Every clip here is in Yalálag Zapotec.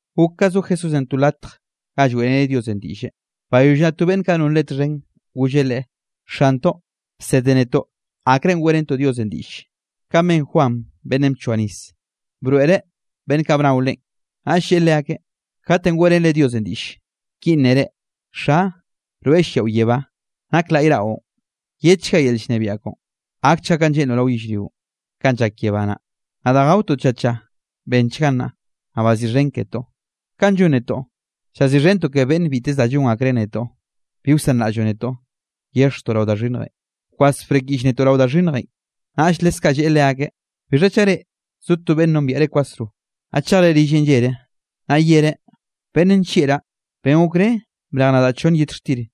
Gok ka zo Jesúsenꞌ to latj ga lloeꞌreneꞌ Diosenꞌ diꞌlle, bayoll naꞌ to beꞌnn kaꞌ non Leꞌe txhen, golleꞌ Leꞌe: —Xantoꞌ, bsede netoꞌ akrenꞌ weꞌrentoꞌ Diosenꞌ diꞌll, kanꞌ ben Juan beꞌnnenꞌ bchoa nis, broeꞌreꞌ beꞌnn kaꞌ bnao leꞌen. Naꞌll lleꞌe leakeꞌ: —Kate weꞌrenre Diosenꞌ diꞌll, ki nnere: Xa, rweꞌ lliaꞌo yebá, nak laꞌy raꞌon. Yedchga yel llnebiaꞌ koꞌon. Gakchga kanꞌ lleꞌnroꞌ rao yellrionꞌ, kanꞌ llak yebá naꞌ. Naꞌ danꞌ gaotoꞌ tlla tlla, bennchgan nnaꞌ. Naꞌ baziꞌxhen ketoꞌ, kanꞌ llon netoꞌ, llaziꞌxhentoꞌ ke beꞌnn biteze da llon akreꞌ netoꞌ. Bi wsanraꞌlloꞌ netoꞌ, yexjtoꞌ rao da xhinnjenꞌ, bkwas brekyiꞌll netoꞌ rao da xhinnjenꞌ. Naꞌll leskaꞌ lleꞌe leakeꞌ: —Bixha chaꞌ reꞌ, zo to beꞌnn nombiaꞌre kwasro, naꞌ chejre rilleꞌn llere, naꞌ yereꞌ: “Beꞌnn nllieꞌraꞌ, ben gokre brej nadaꞌ chonn yet xtir;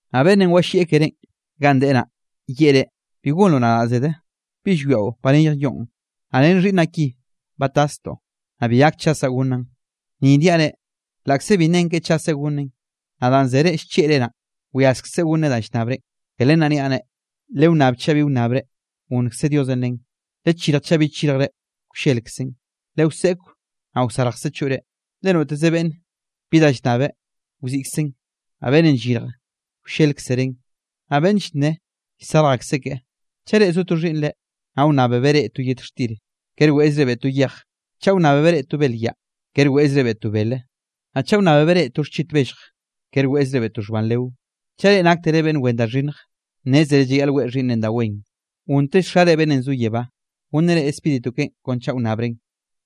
Naꞌ beꞌnnenꞌ walliꞌ kerénꞌ ganꞌ deꞌe naꞌ, yeꞌe reꞌ: “Bi gonroꞌ nadaꞌ zede, ¿bi llwiaꞌo ba neyj yoꞌn, naꞌ ren xhiꞌnnaꞌ ki ba tastoꞌ, naꞌ bi gak chasaꞌ gonnaꞌn?” Ni niaꞌ reꞌ, laꞌkze bi nnen ke chaseꞌ gonneꞌn, naꞌ danꞌ zere llchieꞌre naꞌ, wyaskzeꞌ gonneꞌ danꞌ llnnabrenꞌ. Ke len naꞌ niaꞌ reꞌ: Lewnnab, chaꞌ bi wnnabre, gonnkze Diosenꞌ len; lechirj, chaꞌ bi chirjre, wllelkzen; lewseꞌkw, naꞌ wyarjkze choꞌre. Le noteze beꞌnne bi da llnnabeꞌ, wziꞌkzeꞌn; naꞌ beꞌnn llyirjeꞌ, wllelkzereꞌn; naꞌ beꞌnn llnneꞌe, llsarj akseꞌ keꞌe. ’Chaꞌ reꞌ zo to xhiꞌnnre, naꞌ wnnábebeꞌ reꞌ to yet xtir, kere weꞌzrebeꞌ to yej. Chaꞌ wnnábebeꞌ reꞌ to belyaꞌ, kere weꞌzrebeꞌ to bele. Naꞌ chaꞌ wnnábebeꞌ reꞌ to xchit bellj, kere weꞌzrebeꞌ to xhban leo. Chaꞌ reꞌ naktere beꞌnn wen da xhinnj, nnézere llayaꞌl weꞌe xhiꞌnnre da wen, gonntell Xare beꞌnnenꞌ zo yebá, gonneꞌ reꞌ Spíritu keꞌen kon chaꞌ wnnabren.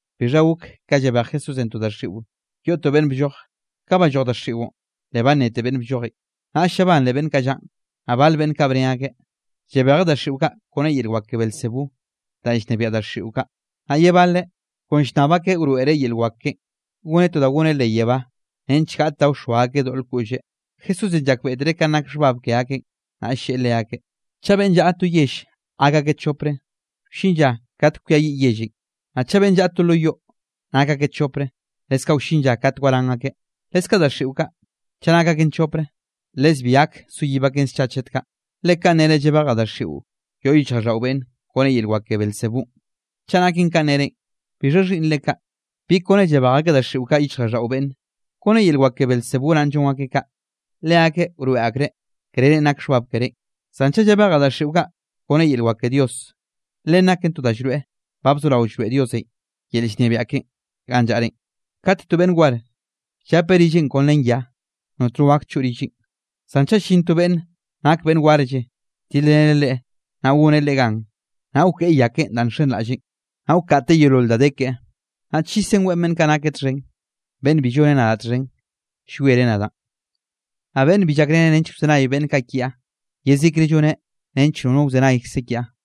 Bixha gok ka llabej Jesúsenꞌ to daxiꞌo yoꞌ to beꞌnn blloj; ka balloj daxiꞌon, le bannete beꞌnn bllojenꞌ. Naꞌll llabanre beꞌnn kaꞌ llaꞌn. Naꞌ bal beꞌnn kaꞌ bne akeꞌ: —Llabejeꞌ daxiꞌo kaꞌ kone yel wak ke Beelzebú danꞌ llnebiaꞌ daxiꞌo kaꞌ. Naꞌ ye baleꞌ, kon llnnab akeꞌ wroeꞌreꞌ yel wak keꞌen, goneꞌ to da goneꞌ leꞌ yebá, nench gaꞌt da wxoa akeꞌ doꞌl koꞌlleꞌ. Jesúsenꞌ llakbeꞌtereꞌ kanꞌ nak xhbab ke akeꞌn, naꞌll lleꞌe leakeꞌ: —Chaꞌ beꞌnn llaꞌa to yell gak akeꞌ chopre, wllin lla kate kwiayiꞌ yellenꞌ. Naꞌ chaꞌ beꞌnn llaꞌa to lo yoꞌ, nak akeꞌ chopre, leskaꞌ wllin lla kate waran akeꞌ. Leskaꞌ daxiꞌo kaꞌ, chaꞌ nak aken chopre, les bi gak soyib aken scha chet kaꞌ. Le kanꞌ nere llabejaꞌ daxiꞌo yoꞌ yichjraꞌlldaꞌo beꞌnne kone yel wak ke Beelzebúnꞌ. Chaꞌ naken kanꞌ nerenꞌ, ¿bixha xhiꞌnnre kaꞌ, bi kone llabej akeꞌ daxiꞌo kaꞌ yichjraꞌlldaꞌo beꞌnne? ¿Kone yel wak ke Beelzebú naꞌn llon akeꞌ kaꞌ? Leakeꞌ wroeꞌ akreꞌ, krerenꞌ nak xhbab kerénꞌ. Zan chaꞌ llabejaꞌ daxiꞌo kaꞌ kone yel wak ke Dios, len naken to da llroeꞌ ba bzorao llroeꞌ Diosenꞌ yel llnebiaꞌ keꞌen ganꞌ llaꞌrenꞌ. ’Kate to beꞌnn war, llapeꞌ rilleꞌn kon ren ya, notno gak choꞌ rilleꞌn. Zan chaꞌ llin to beꞌnn nak beꞌnn warlle tilreneꞌ leꞌe, naꞌ goneꞌ leꞌe gan, naꞌ wkeꞌe ya keꞌen danꞌ nxenraꞌlleꞌn, naꞌ wkaꞌteꞌ yeolol da de keꞌe, naꞌ chisen weꞌe beꞌnn kaꞌ nakeꞌ txhen. ’Beꞌnn bi lloneꞌ nadaꞌ txhen, llwiereꞌ nadaꞌn. Naꞌ beꞌnn bi llakreneꞌ nench wzenay beꞌnn kaꞌ kiaꞌ, yezikre lloneꞌ nench nono wzenaykze kiaꞌ.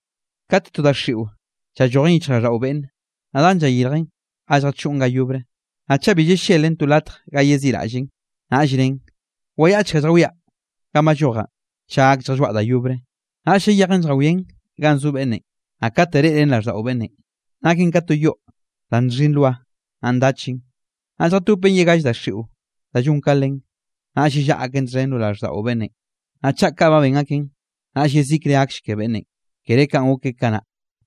’Kate to daxiꞌo llallojen yichjraꞌlldaꞌo beꞌnnenꞌ, naꞌ dan llayirjen ga lljachoꞌn ga yobre. Naꞌ chaꞌ bi ll-llelen to latj ga yeziꞌraꞌllen, naꞌll nnen: “Wayaꞌchkaꞌ lljawiaꞌ ganꞌ ballojaꞌn, chaꞌ gak lljalloaꞌ da yobre.” Naꞌll llayejen lljawian ganꞌ zo beꞌnnenꞌ, naꞌ kate reꞌren raꞌlldaꞌo beꞌnnenꞌ, naken ka to yoꞌ da nxhi nloa, naꞌ ndachen. Naꞌll lljatopen ye gall daxiꞌo da llonll ka len, naꞌll yellaꞌa aken txhen lo raꞌlldaꞌo beꞌnnenꞌ. Naꞌ chaꞌ kaꞌ ba ben akeꞌn, naꞌll yezikre gakll ke beꞌnnenꞌ, kere kanꞌ gok keꞌe kanaꞌ.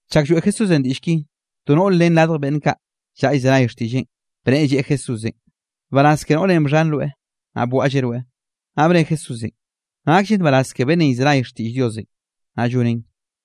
Chak lloeꞌ Jesúsenꞌ diꞌll ki, to noꞌr ren radj beꞌnn kaꞌ llaꞌa llzenay xtiꞌlleꞌn, bnneꞌe lleꞌe Jesúsenꞌ: —Nbaraz ke noꞌrenꞌ bxhan rweꞌ, naꞌ bwaꞌlleꞌ rweꞌ. Naꞌ bne Jesúsenꞌ: —Nakllen nbaraz ke beꞌnnenꞌ llzenay xtiꞌll Diosenꞌ, naꞌ lloneꞌn.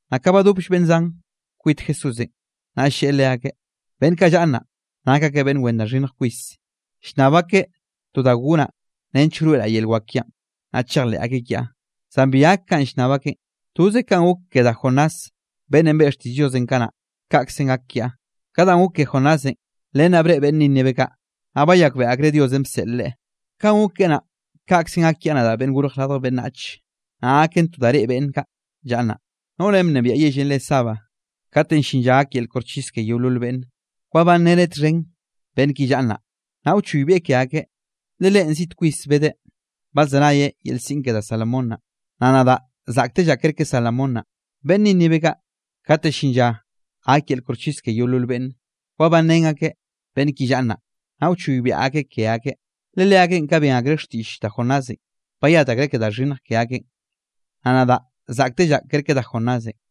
Naꞌ ka badop beꞌnn zanll kwit Jesúsenꞌ, naꞌll lleꞌe leakeꞌ: —Beꞌnn kaꞌ llaꞌa nnaꞌ, nak akeꞌ beꞌnn wen da xhinnj kwis, llnnab akeꞌ to da gonaꞌ nench wroeꞌraꞌ yel wak kiaꞌn, naꞌ chejleꞌ akeꞌ kiaꞌ; zan bi gak kanꞌ llnnab akeꞌn, toze kanꞌ gok ke da Jonás beꞌnnenꞌ beꞌe xtiꞌll Diosenꞌ kanaꞌ, kaꞌkzenꞌ gak kiaꞌ. Ka danꞌ gok ke Jonásenꞌ, len naꞌ breꞌe beꞌnn Nínive kaꞌ, naꞌ bayakbeꞌe akreꞌ Diosenꞌ bseꞌl leꞌe. Kaꞌn gok keꞌe naꞌ, kaꞌkzenꞌ gak kiaꞌ nadaꞌ Beꞌnnenꞌ Gorj Radj Beꞌnnach, naꞌ gaken to da reꞌe beꞌnn kaꞌ llaꞌa nnaꞌ. Noꞌrenꞌ bnebiaꞌ yellenꞌ re Sabá, kate llin lla gak yel koxchis ke yeolol beꞌnne, wabanreneꞌ txhen beꞌnn ki llaꞌa nnaꞌ, naꞌ wchoybieꞌ ke akeꞌ, le leꞌen ziꞌt kwis bedeꞌ badzenayeꞌ yel siꞌn ke da Salomón naꞌ, naꞌ nadaꞌ zaꞌktellaꞌ kerke Salomón naꞌ. Beꞌnn Nínive kaꞌ, kate llin lla gak yel koxchis ke yeolol beꞌnne, wabanrén akeꞌ beꞌnn ki llaꞌa nnaꞌ, naꞌ wchoybiaꞌ akeꞌ ke akeꞌ, le leakeꞌn ka ben akreꞌ xtiꞌll da Jonásenꞌ, bayat akreꞌ ke da xhinnj ke akeꞌn, naꞌ nadaꞌ zaꞌktellaꞌ kerke da Jonásenꞌ.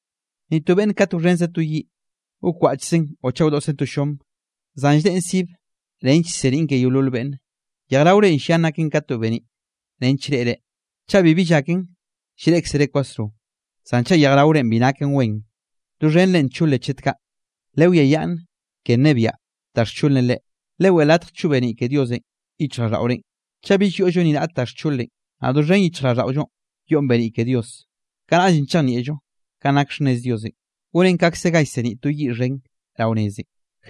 ’Ni to beꞌnne kate wxhenzeꞌ to yiꞌ, wkwaꞌchzeꞌn o chaꞌ wdoꞌszeꞌn to llom, zan lldeꞌen sibe nench llseniꞌn ke yeolol beꞌnne. Yejraore llian naken ka to beniꞌ nench reꞌre. Chaꞌ bibi llaken, llreꞌkzere kwasro. Zan chaꞌ yejraorenꞌ bi naken wen, doxhenre ncholen chet kaꞌ. Lewiayaꞌnn ke nnebiaꞌ da xcholenꞌ reꞌ, leweꞌe latj choꞌ beniꞌ ke Diosenꞌ yichjraꞌlldaꞌorenꞌ. Chaꞌ bill yoꞌllo ni raꞌt da xcholenꞌ, naꞌ doxhen yichjraꞌlldaꞌollo yoꞌn beniꞌn ke Dios, kanaꞌllenꞌ chejnieꞌllo kanꞌ nak xhnnez Diosenꞌ, gonen kaꞌkze ga llseniꞌ to yiꞌ xhen rao nezenꞌ.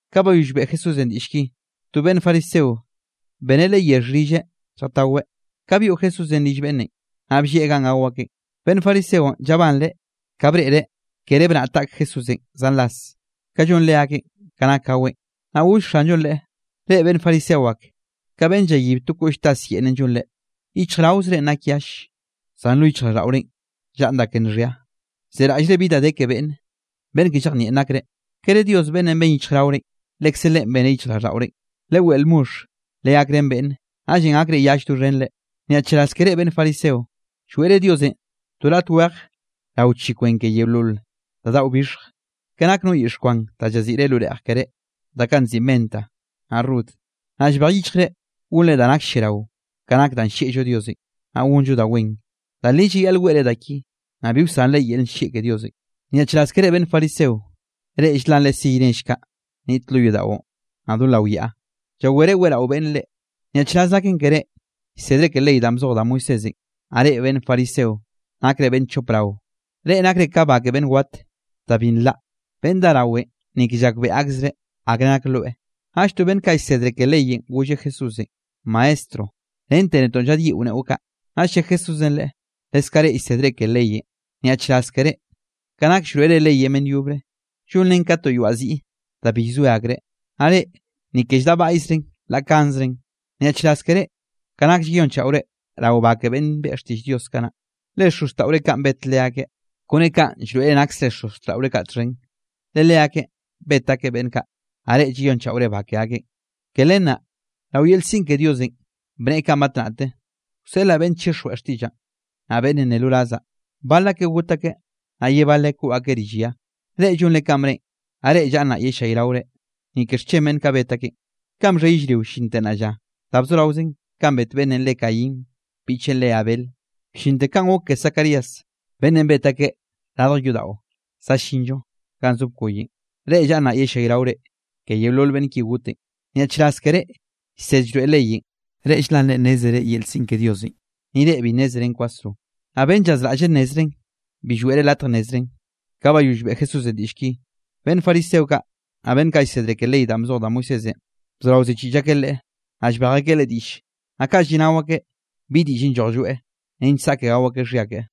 Ka bayoll beꞌe Jesúsenꞌ diꞌll ki, to beꞌnn fariseonꞌ beneꞌ Leꞌe yexh rilleꞌ lljataweꞌ. Ka byoꞌ Jesúsenꞌ rill beꞌnnenꞌ, naꞌ bllieꞌ ganꞌ gao akeꞌn. Beꞌnn fariseonꞌ llabanreꞌ ka breꞌreꞌ kere bnaꞌa taꞌk Jesúsenꞌ zan ras, kanꞌ llon leakeꞌn ka nak gaweꞌn. Naꞌll goll Xanllonꞌ leꞌe: —Reꞌ beꞌnn fariseo ake, ka beꞌnn llayib to koꞌllze tas yeꞌnnenꞌ llonre. Yichjraozrenꞌ nak yall, zan lo yichjraꞌlldaꞌorenꞌ llaꞌn da ke nxhia, llzeraꞌllre bi da de ke beꞌnne. ¡Beꞌnn ke llejnieꞌn nakre! ¿Kere Diosenꞌ beꞌnnenꞌ ben yichjraorenꞌ, lekze Leꞌen beneꞌ yichjraꞌlldaꞌorenꞌ? Leweꞌe lmoxh, legakrén beꞌnne, naꞌllenꞌ gakre yall doxhenre. ’¡Nyaꞌchraz ke reꞌ beꞌnn fariseo! Lloeꞌre Diosenꞌ to raꞌt wej rao chi kwen ke yeolol da daꞌo bixhj, ke nak no yixh kwan da llaziꞌre lo reꞌj keré, da kaꞌ nziꞌi menta naꞌ rud, naꞌ llbej yichjrenꞌ gonre da nak lliarao, ka nak danꞌ llieꞌllo Diosenꞌ, naꞌ gonllo da wen. Da li da llayaꞌl weꞌre da ki, naꞌ bi wsanre yel nllieꞌ ke Diosenꞌ. ’¡Nyaꞌchraz ke reꞌ, beꞌnn fariseo! Reꞌ ll-lanre siy nell kaꞌ niꞌt lo yodaꞌon, naꞌ do lao yaꞌa, llawere weꞌrao beꞌnn reꞌ. ’¡Nyaꞌchraz naken keré llsedre ke ley danꞌ bzoj da Moisésenꞌ, naꞌ reꞌ beꞌnn fariseo! ¡Nakre beꞌnn chop rao! Reꞌ nakre ka ba ke beꞌnn wat, da bi nlaꞌ; beꞌnn dá rawenꞌ, ni ke llakbeꞌe akzreꞌ akre nak loe. Naꞌll to beꞌnn kaꞌ llsedre ke leyenꞌ golleꞌ Jesúsenꞌ: —Maestro, rente netoꞌ llaꞌdyiꞌo neꞌo kaꞌ. Naꞌll lle Jesúsenꞌ leꞌe: —Leskaꞌ reꞌ llsedre ke leyenꞌ, nyaꞌchraz ke reꞌ, ka nak llroeꞌre leyenꞌ beꞌnn yobre, llonrenꞌ ka to yoaꞌ ziꞌ da bi llzoe akreꞌ, naꞌ reꞌ, ni ke lldaꞌbaꞌyzre la kanzeren. ’¡Nyaꞌchraz ke reꞌ, ka nak llayonchaꞌore rao ba ke beꞌnn beꞌe xtiꞌll Diosenꞌ kanaꞌ, le xozxtaꞌore kaꞌn bet leakeꞌ! Kone kaꞌ llroeꞌre naksre xozxtaꞌore kaꞌ txhen, le leakeꞌn bet akeꞌ beꞌnn kaꞌ, naꞌ reꞌ llayonchaꞌore ba ke akeꞌn. ’Ke len naꞌ, rao yel siꞌn ke Diosenꞌ bneꞌe kaꞌn batnaꞌte: “Wseꞌlaꞌ beꞌnn chixjweꞌ xtiꞌllaꞌn, naꞌ beꞌnn nne lo razaꞌ, bal akeꞌ got akeꞌ, naꞌ ye baleꞌ koꞌ akeꞌ rill ya.” Reꞌ llonre kanꞌ bneꞌen, naꞌ reꞌ llaꞌa nnaꞌ yellayraore, ni ke xchen beꞌnn kaꞌ bet akeꞌn, kanꞌ bxhe yellrio llinte nnaꞌ lla. Da bzoraozen kanꞌ bet beꞌnnenꞌ re Caín biꞌcheꞌn re Abel, bllinte kanꞌ gok ke Zacarías, beꞌnnenꞌ bet akeꞌ radj yodaꞌo za llinl-llo ganꞌ zo bkoyenꞌ, reꞌ llaꞌa nnaꞌ yellayraore ke yeolol beꞌnn ki gotenꞌ. ’¡Nyaꞌchraz ke reꞌ llsed llroeꞌ leyenꞌ! Reꞌ ll-lanre nnézere yel siꞌn ke Diosenꞌ, ni reꞌ bi nnézeren kwasro, naꞌ beꞌnn llazraꞌlleꞌ nnezreꞌn, bi lloeꞌre latj nnezreꞌn. Ka bayoll beꞌe Jesúsenꞌ diꞌll ki, beꞌnn fariseo kaꞌ, naꞌ beꞌnn kaꞌ llsedre ke ley danꞌ bzoj da Moisésenꞌ, bzorao ziꞌchiꞌll akeꞌ Leꞌe, naꞌ llbej akeꞌ Leꞌe diꞌll. Naꞌ kaꞌ lliꞌnao akeꞌ bi diꞌllenꞌ lloj lloeꞌ, nench saꞌke gao akeꞌ xhia keꞌe.